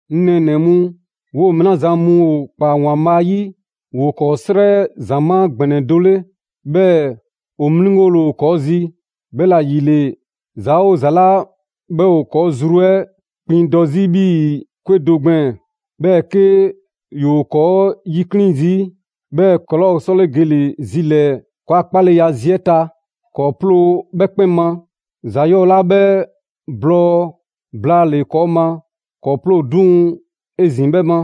'Ŋ nɛɛnɛ‑ mu, 'woo‑ mɛɛ 'la zan mu ‑o ‑kpaa ‑Waanbhaa' 'yi, ‑woo ‑kɔɔ' 'srɛ ‑zamaa' ‑gbɛnɛ do 'le, 'bhɛɛ‑ ‑o 'mliŋgole ‑o ‑kɔɔ' zi. 'Bhɛla‑ ‑yile, ‑za 'oo ‑za 'la 'bhɛ ‑o ‑kɔɔ' zru 'ɛ kpiŋdɔ 'zi 'bhii‑ 'kwe do gbɛɛn‑, 'bhɛɛ‑ 'ke ‑yoo ‑kɔɔ' 'yikliŋ‑ zii', 'bhɛɛ‑ ‑kɔɔ' 'laa ‑o 'sɔle gele‑ zi ‑lɛɛ ‑kɔɔa' 'kpaleya a zi 'ɛ ta; ‑kɔɔ' 'ploo‑ 'bhɛ 'kpɛn ma, ‑za 'yɔɔ 'la 'bhɛ blɔɔ blaale‑ ‑kɔɔ' ma, ‑kɔɔ' 'ploo‑ 'duŋ‑ 'ezin‑ 'bhɛ ma.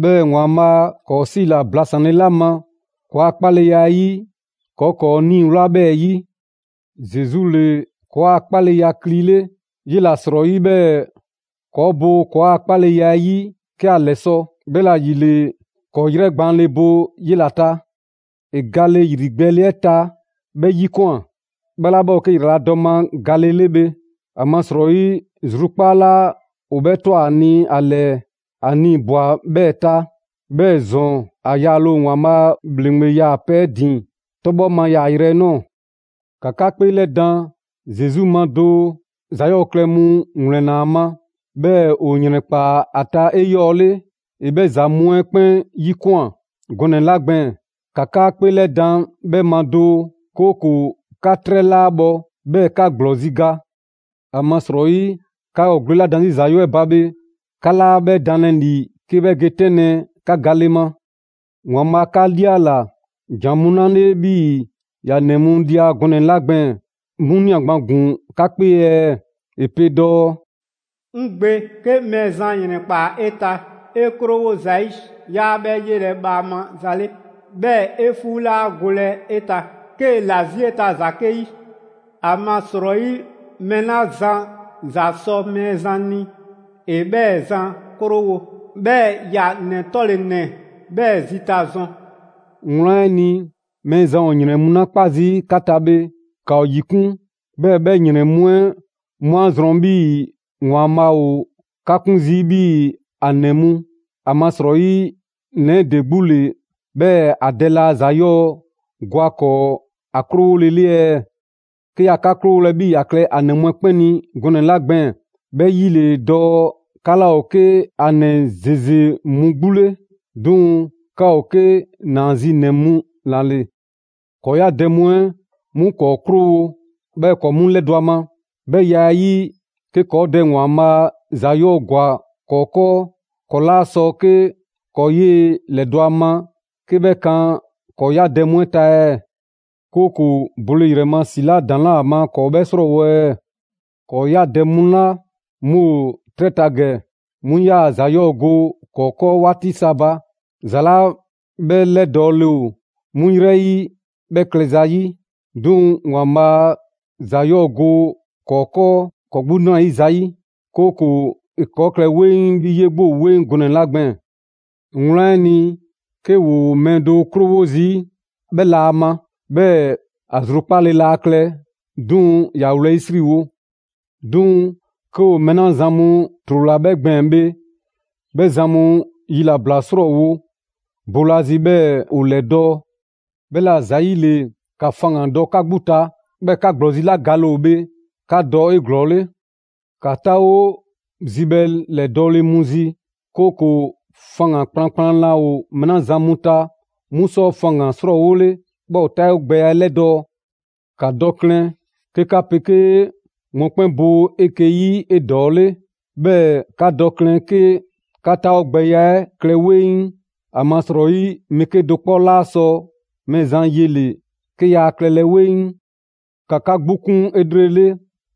'Bhɛɛ‑ ‑Waanbhaa' ‑kɔɔ' 'siila‑ blasanle 'la ma ‑kɔɔ' a 'kpaleya 'ɛ yi, ‑kɔɔ' ‑kɔɔ' 'niiwla 'bhɛɛ‑ 'yi. Zesu ‑le ‑kɔɔa' 'kpaleya 'ɛ kli 'le, 'yela‑ 'srɔyi 'bhɛɛ‑ ‑kɔɔ' bo ‑kɔɔa' 'kpaleya 'ɛ 'yi 'ke ‑a ‑lɛsɔ'. 'Bhɛla‑ ‑yile, ‑kɔɔ' 'yrɛ gbaanle bo 'yela‑ ta. ‑E gale ‑yrigbɛɛle 'ɛ ta 'bhɛ 'yikwan꞊, 'bhɛ 'la 'bhɛ ‑o 'ke ‑yraladɔ ma gale 'le bhe. ‑Amasrɔyi zrukpaa' 'la ‑o 'bhɛ ꞊twa ‑a ni ‑a ‑lɛɛ, ‑a nii‑ ꞊bwa 'bhɛɛ‑ ta. 'Bhɛɛ‑ ‑zɔn, ‑a yaale ‑o ‑Waanbhaa' a ‑bhleŋgbe 'yaakpe‑ 'ɛ ‑din 'tɔbhɔ ma yaayrɛ 'ɛ ꞊nɔɔ. ‑Ka 'ka 'kpeelɛdan Zesu ma doo: ‑za 'yɔɔ klɛ mu ‑wlɛnna ‑a ma, 'bhɛɛ‑ ‑o ‑yrɛnkpaa ‑a ta 'eyɔɔle. ‑E 'bhɛ ‑za mu 'ɛ 'kpɛn 'yikwan꞊ gɔnɛ‑ 'la gbɛɛn‑, ‑ka 'ka 'kpeelɛdan 'bhɛ ma doo; 'kooko‑ 'ka 'trɛ 'laa bhɔ, 'bhɛɛ‑ 'ka ‑gblɔzi' ga. ‑Amasrɔyi 'ka ‑o gwle 'la dan 'zi ‑za 'yɔɔ‑ 'ɛ ba bhe, 'ka 'laa 'bhɛ danlɛ ‑li 'ke 'bhɛ ge 'tɛnlɛ‑ 'ka gale ma. ‑Waanbhaa' 'ka 'liala‑ ‑jan mu 'la 'le 'bhii‑ ‑ya ‑nɛ mu lia gɔnɛ‑ 'la gbɛɛn‑, 'mu ꞊nia gban ‑gun 'ka 'kpee ɛɛ? ‑E pe dɔɔ: «'Ŋ gbe, 'ke Mɛɛzan ‑yrɛnkpaa 'e ta, 'e 'krowo zayi', 'yaa 'bhɛ 'yelɛ‑ bhaama za 'le. 'Bhɛɛ‑ 'e 'fuu 'laa golɛ 'e ta 'kee‑ ‑la 'zi 'e ta ‑za 'ke 'yi. ‑Amasrɔyi mɛɛ 'la zan ‑za sɔ Mɛɛzan ni, ‑e 'bhɛɛ‑ zan 'krowo‑. 'Bhɛɛ‑ ‑ya ‑nɛ 'tɔle‑ ‑nɛ 'bhɛɛ‑ zita zɔn.» Wlan 'ɛ ni, Mɛɛzan ‑o ‑yrɛn mu 'la 'kpa zii' 'ka ta bhe, ‑ka ‑o ‑yikun', 'bhɛɛ‑ 'bhɛ ‑yrɛn mu 'ɛ 'mu 'a zrɔn 'bhii‑ ‑Waanbhaa' ‑o 'ka 'kun zii' 'bhii‑ ‑a ‑nɛ mu ‑Amasrɔyi ‑nɛ 'ɛ ‑de 'gbu ‑le, 'bhɛɛ‑ ‑a dɛ laa ‑za 'yɔɔ‑ go ‑a ‑kɔɔ ‑a 'krowolele ɛɛ? 'Ke yaa 'ka 'krowolɛ 'bhii‑ ‑ya klɛ ‑a ‑nɛ mu 'ɛ 'kpɛn ni gɔnɛ‑ 'la gbɛɛn‑, 'bhɛ 'yi ‑le dɔɔ 'ka 'laa ‑o 'ke ‑a ‑nɛ ‑zeze mu 'gbu 'le; 'duŋ‑ 'ka ‑o 'ke ‑naazinɛ mu ‑la ‑le. ‑Kɔɔ' 'ya dɛ mu 'ɛ 'mu ‑kɔɔ' 'krowo‑, 'bhɛɛ‑ ‑kɔɔ' 'mu ‑lɛdɔ' a ma. 'Bhɛ ya 'ɛ 'yi, 'ke ‑kɔɔ' Dɛ ‑Waanbhaa' ‑za 'yɔɔ‑ ‑gwa ‑kɔɔ' 'kɔɔ, ‑kɔɔ' 'laa sɔ 'ke ‑kɔɔ' 'yee‑ ‑lɛdɔ' ‑a ma 'ke 'bhɛ kan ‑kɔɔ' 'ya dɛ mu 'ɛ ta ɛɛ? 'Kooko‑ bole ‑yrɛ ma 'la ‑daŋ' 'laa ‑a ma ‑kɔɔ' 'bhɛ 'srɔɔwo‑ ɛɛ? ‑Kɔɔ' 'ya dɛ mu 'la 'mu ‑o 'trɛ ta ‑gɛ 'mu 'yaa‑ ‑za 'yɔɔ‑ go ‑kɔɔ' 'kɔɔ 'waati sa ba, ‑za 'la 'bhɛ 'lɛdɔɔle ‑o 'mu 'yrɛ 'yi 'bhɛ klɛza 'yi. 'Duŋ‑ ‑Waanbhaa' ‑za 'yɔɔ‑ go ‑kɔɔ' 'kɔɔ ‑kɔɔ' 'gbu 'nrayiza 'yi, 'kooko‑ ‑e ‑kɔɔ' klɛ 'weŋ 'bhii‑ 'yee‑ 'gbu ‑o 'weŋ gɔnɛ‑ 'la gbɛɛn‑. Wlan 'ɛ ni, 'ke ‑woo mɛɛ do 'krowo zii', 'bhɛ la ‑a ma, 'bhɛɛ‑ ‑a zrukpaale laa klɛ, 'duŋ‑ ‑ya wlɛyisriwo. 'Duŋ‑ 'ke ‑o mɛɛ 'la zan mu ‑trola 'bhɛ gbɛɛn‑ bhe, 'bhɛ zan mu yilabla 'srɔɔwo' boolazi 'bhɛɛ‑ ‑o ‑lɛdɔɔ'. 'Bhɛla‑ ‑zayile, ‑ka faŋgandɔ 'ka 'gbu ta, 'bhɛɛ‑ 'ka ‑gblɔzi' 'la gale ‑o bhe, ‑ka dɔ 'eglɔɔle. ‑Ka 'taawo zibhɛ ‑lɛdɔɔle mu zi, 'kooko‑ faŋgan‑ kplankplan laa ‑o mɛɛ 'la zan mu ta, 'mu sɔ faŋgan‑ 'srɔɔwole; 'bhɛɛ‑ ‑o 'taawogbɛya 'ɛ 'lɛdɔɔ‑. ‑Ka dɔ klɛn 'ke 'ka 'pegee mɔkpɛn' bo 'eke‑ 'yi 'edɔɔle; 'bhɛɛ‑ ‑ka dɔ klɛn 'ke 'ka 'taawogbɛya 'ɛ klɛ 'weŋ. ‑Amasrɔyi mɛɛ 'kedo‑ 'kpɔ 'laa sɔ Mɛɛzan yele‑ 'ke ‑yaa klɛlɛ 'weŋ. ‑Ka 'ka 'gbu 'kun 'elrele,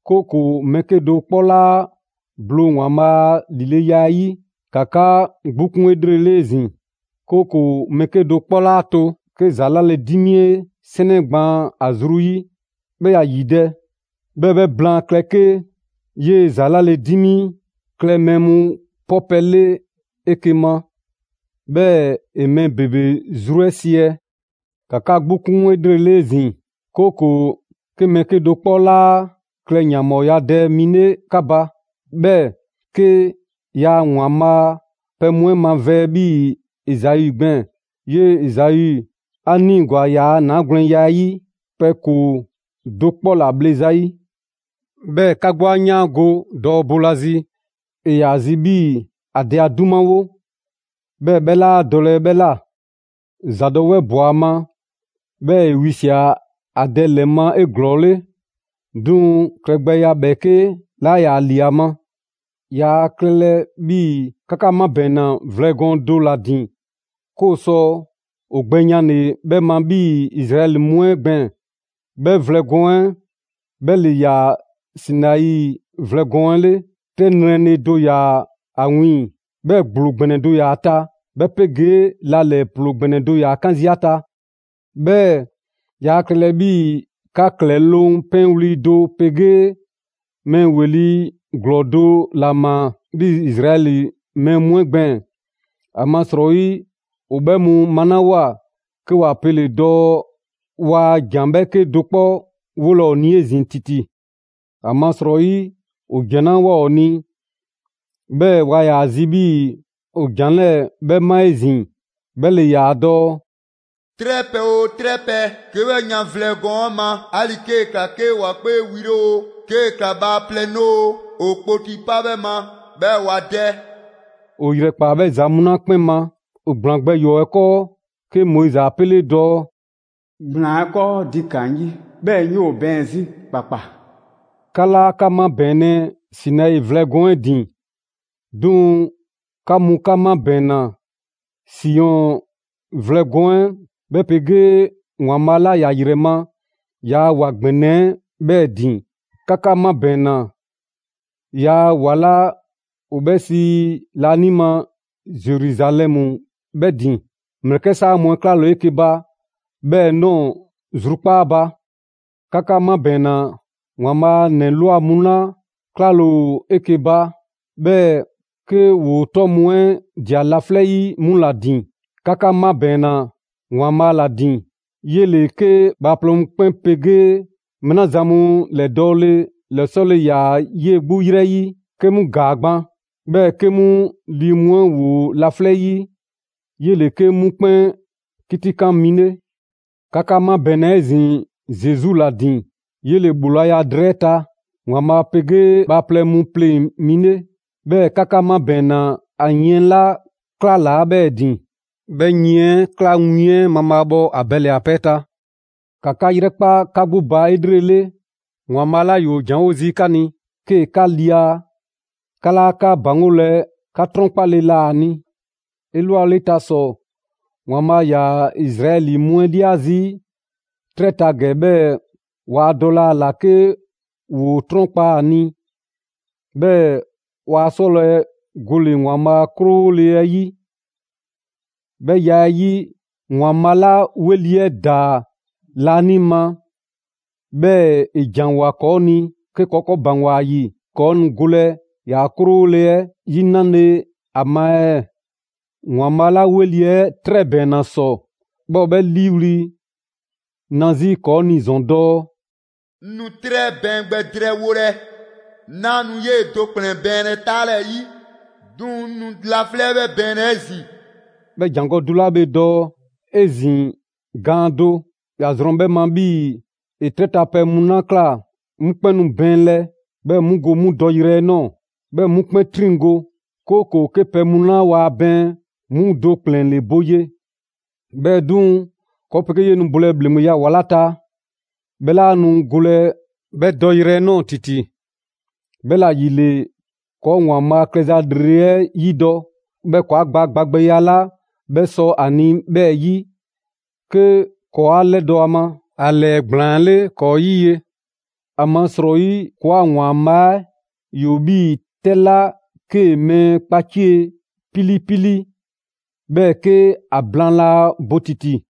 'kooko‑ mɛɛ 'kedo‑ 'kpɔ 'laa bloo ‑Waanbhaa' a ‑lileya 'ɛ 'yi. ‑Ka 'ka 'gbu 'kun 'elrele 'ezin‑, 'kooko‑ mɛɛ 'kedo‑ 'kpɔ 'laa to 'ke ‑za 'lale‑ 'dimi 'e 'sɛnɛ gbaan ‑a zru 'yi, 'bhɛɛ‑ ‑ya ‑yidɛ'; 'bhɛɛ‑ 'bhɛ blaan klɛ 'ke 'yee‑ ‑za 'lale‑ 'dimi klɛ mɛɛ mu 'pɔ pɛ 'le 'eke‑ ma, 'bhɛɛ‑ ‑e mɛɛ ‑bebe zru 'ɛ 'siɛ‑. ‑Ka 'ka 'gbu 'kun 'elrele 'ezin‑, 'kooko‑ 'ke mɛɛ 'kedo‑ 'kpɔ 'laa klɛ ‑yanbhɔɔyadɛ mi 'le 'ka ba, 'bhɛɛ‑ 'ke yaa ‑Waanbhaa' a pɛ mu 'ɛ mavɛɛ 'bhii‑ Ezau gbɛɛn‑. 'Yee‑ Ezau 'a 'niigwa‑ ‑yaa' ‑naagwlɛnya 'ɛ 'yi pɛ ‑koo do 'kpɔ ‑la bhle ‑zayi'. 'Bhɛɛ‑ 'ka 'gbu 'a 'yaango‑ dɔɔ boolazi, ‑e ‑yaa ‑a zi' 'bhii‑ ‑a dɛ 'a 'dumawo, 'bhɛɛ‑ 'bhɛ 'laa dɔlɛ 'bhɛ ꞊la. ‑Zadɔwɛɛ ꞊bwa ‑a ma, 'bhɛɛ‑ ‑e wisia꞊ ‑a dɛ ‑lɛ ma 'eglɔɔle, 'duŋ‑ klɛgbɛya ‑bhɛɛke' 'laa ‑yaa ‑li ‑a ma. Yaa klɛlɛ 'bhii‑ 'ka 'ka 'mabɛɛnna vlɛ gɔɔn do ‑la ‑din 'ke ‑o sɔ ‑o gbɛyanle 'bhɛ ma 'bhii‑ Izraɛli mu 'ɛ gbɛɛn‑. 'Bhɛ vlɛ gɔɔn 'ɛ 'bhɛ ‑le ‑yaa Sinai vlɛ gɔɔn 'ɛ 'le: 'Tɛ 'yranle‑ do ‑yaa ‑a wiiŋ‑, 'bhɛɛ‑ ‑gblo ‑gbɛnɛ do ‑yaa ‑a ta, 'bhɛ 'pegee la ‑lɛɛ ‑ploo ‑gbɛnɛ do ‑yaa 'kan zii' ‑a ta. 'Bhɛɛ‑ yaa klɛlɛ 'bhii‑ 'ka ‑klɛloŋ' 'pɛnwli‑ do 'pegee mɛɛ ‑weli' ‑glɔɔ do ‑la ꞊maa 'bhii‑ Izraɛli mɛɛ mu 'ɛ gbɛɛn‑. ‑Amasrɔyi ‑o 'bhɛ mu malawoa, 'ke ‑wa pele‑ dɔɔ waa ‑jan ‑bhɛɛke' do 'kpɔ 'wolɛ‑ ‑o ni 'ezin‑ ‑titi. ‑Amasrɔyi ‑o ‑jan 'la ꞊woa ‑o ni, 'bhɛɛ‑ waa ‑yaa zi 'bhii‑ ‑o ‑jan 'lɛɛ‑ 'bhɛ 'ma 'ezin‑ 'bhɛ ‑le ‑yaa dɔɔ: «'Trɛpɛ‑ 'oo 'trɛpɛ‑, 'ke 'bhɛ ꞊yaan vlɛ gɔɔn 'ɛ ma, 'ali‑ 'kee‑ ‑kla 'ke ‑wa 'kpee wi 'le oo, 'kee‑ ꞊kla bhaaplɛŋ 'le oo, ‑o kpoti 'pa 'bhɛ ma, 'bhɛɛ‑ ‑wa dɛ.» ‑O ‑yrɛkpaa 'bhɛ ‑za mu 'la 'kpɛn ma, ‑o ‑gblaan gbɛ ‑yɔɔ' 'ɛ 'kɔɔ, 'ke Moizi 'a 'pele dɔɔ: «‑Gblaan 'ɛ 'kɔɔ, ‑di ꞊kaan 'ŋ 'yi, 'bhɛɛ‑ 'ŋ 'yoo‑ bɛɛn 'zi ‑kpakpa!» 'Ka 'laa 'ka 'mabɛɛnlɛ Sinai vlɛ gɔɔn 'ɛ ‑din, 'duŋ‑ 'ka mu 'ka 'mabɛɛnna Siɔn vlɛ gɔɔn 'ɛ 'bhɛ 'pegee ‑Waanbhaa' 'la ‑ya ‑yrɛ ma ‑yaa' ‑wa ‑gbɛnɛ 'ɛ 'bhɛɛ‑ ‑din. 'Ka 'ka 'mabɛɛnna ‑yaa' ‑wa 'la ‑o 'bhɛ sii laanima Zeruzalɛmu 'bhɛɛ‑ ‑din; ‑mlɛkɛ' 'saa mu 'ɛ 'klale ‑o 'eke‑ ba 'bhɛɛ‑ ꞊nɔɔ zrukpaa' ba. 'Ka 'ka 'mabɛɛnna ‑Waanbhaa' a ‑nɛ ꞊lwa mu 'la 'klale‑ ‑o 'eke‑ ba, 'bhɛɛ‑ 'ke ‑woo 'tɔ mu 'ɛ ꞊dia laflɛ' 'yi, 'mu ‑la ‑din. 'Ka 'ka 'mabɛɛnna ‑Waanbhaa' ‑la ‑din. 'Yele‑ 'ke bhaaplɛŋ mu 'kpɛn 'pegee mɛɛ 'la zan mu ‑lɛdɔɔle ‑lɛsɔle ‑yaa 'yee‑ 'gbu 'yrɛ 'yi, 'ke 'mu ‑gaa gban, 'bhɛɛ‑ 'ke 'mu lii mu 'ɛ ‑woo laflɛ' 'yi; 'yele‑ 'ke 'mu 'kpɛn 'kitikan mi 'le. 'Ka 'ka 'mabɛɛnna 'ezin‑ Zesu ‑la ‑din; 'yele‑ ‑bhoolaya drɛɛ 'ɛ ta ‑Waanbhaa' 'pegee bhaaplɛŋ mu pleŋ‑ mi 'le. 'Bhɛɛ‑ 'ka 'ka 'mabɛɛnna ‑a yiɛn 'la 'klalaa‑ 'bhɛɛ‑ ‑din. 'Bhɛ yiɛn 'ɛ ꞊klaa win 'ɛ mabhaabhɔ Abɛli a pɛ 'ɛ ta. ‑Ka 'ka 'yrɛkpa 'ka 'gbu ba 'elrele, ‑Waanbhaa' 'la ‑yoo janwo zii' 'ka ni 'kee‑ 'ka lia, 'ka 'laa 'ka ‑baŋgolɛ 'ka 'trɔnkpale ‑la ‑a ni. 'Elwale ta ‑sɔ, ‑Waanbhaa' ‑yaa Izraɛli mu 'ɛ 'lia zii' 'trɛ ta ‑gɛ 'bhɛɛ‑ waa dɔlɛ ‑a ‑la 'ke ‑woo 'trɔnkpa a ni, 'bhɛɛ‑ waa 'sɔlɛ‑ gole‑ ‑Waanbhaa' a 'krowole 'ɛ 'yi. 'Bhɛ ya 'ɛ 'yi, ‑Waanbhaa' 'la ‑weli' 'ɛ ꞊daa laanima 'bhɛɛ‑ ‑e ‑janwoa ‑kɔɔ' ni, 'ke ‑kɔɔ' ‑kɔɔ' ‑baŋgwa ‑a ‑yi, ‑kɔɔ' nu golɛ ‑yaa' 'krowole 'ɛ 'yi 'nale‑ ‑a ma ɛɛ? ‑Waanbhaa' 'la 'weli‑ 'trɛ 'ɛ ‑bɛɛnna ‑sɔ, 'bhɛ ‑o 'bhɛ 'liiwli‑ na 'zi ‑kɔɔ' ni ‑zɔn dɔɔ: «'Ŋ nu 'trɛ 'ɛ bɛɛn gbɛ drɛɛwolɛ; 'naa nu 'yee‑ do ‑kplɛn bɛɛnlɛ 'taalɛɛyi, 'duŋ‑ 'ŋ nu laflɛ' 'ɛ 'bhɛ bɛɛnlɛ 'ezin‑.» 'Bhɛ ‑jangɔ' do 'la bhe dɔɔ: «'Ezin‑ gaan do», ‑ya zrɔn 'bhɛ ma 'bhii‑ ‑e 'trɛ ta pɛ mu 'la ꞊kla 'mu 'kpɛn nu bɛɛnlɛ, 'bhɛɛ‑ 'mu go 'mu dɔyrɛ 'ɛ ꞊nɔɔ, 'bhɛɛ‑ 'mu 'kpɛn 'triŋgo‑; 'kooko‑ 'ke pɛ mu 'la waa bɛɛn, 'mu do ‑kplɛn ‑le bo ye. 'Bhɛɛ‑ 'duŋ‑, ‑kɔɔ' 'pegee 'yee‑ nu bolɛ ‑bhleŋgbeya ‑wa 'la ta, 'bhɛ 'laa nu golɛ 'bhɛ dɔyrɛ 'ɛ ꞊nɔɔ ‑titi. 'Bhɛla‑ ‑yile, ‑kɔɔ' ‑Waanbhaa' klɛza ‑lrele' 'ɛ 'yidɔ‑, 'bhɛɛ‑ ‑kɔɔ' 'a gba gba gbɛya 'la 'bhɛ sɔ ‑a ni 'bhɛɛ‑ 'yi; 'ke ‑kɔɔ' 'a 'lɛdɔ‑ ‑a ma, ‑a ‑lɛɛgblaan 'le ‑kɔɔ' 'yi ye. ‑Amasrɔyi ‑kɔɔa' ‑Waanbhaa' 'ɛ ‑yoo 'bhii‑ 'tɛ 'la 'kee‑ mɛɛ kpacie 'pilipili, 'bhɛɛ‑ 'ke a blaan laa bo ‑titi.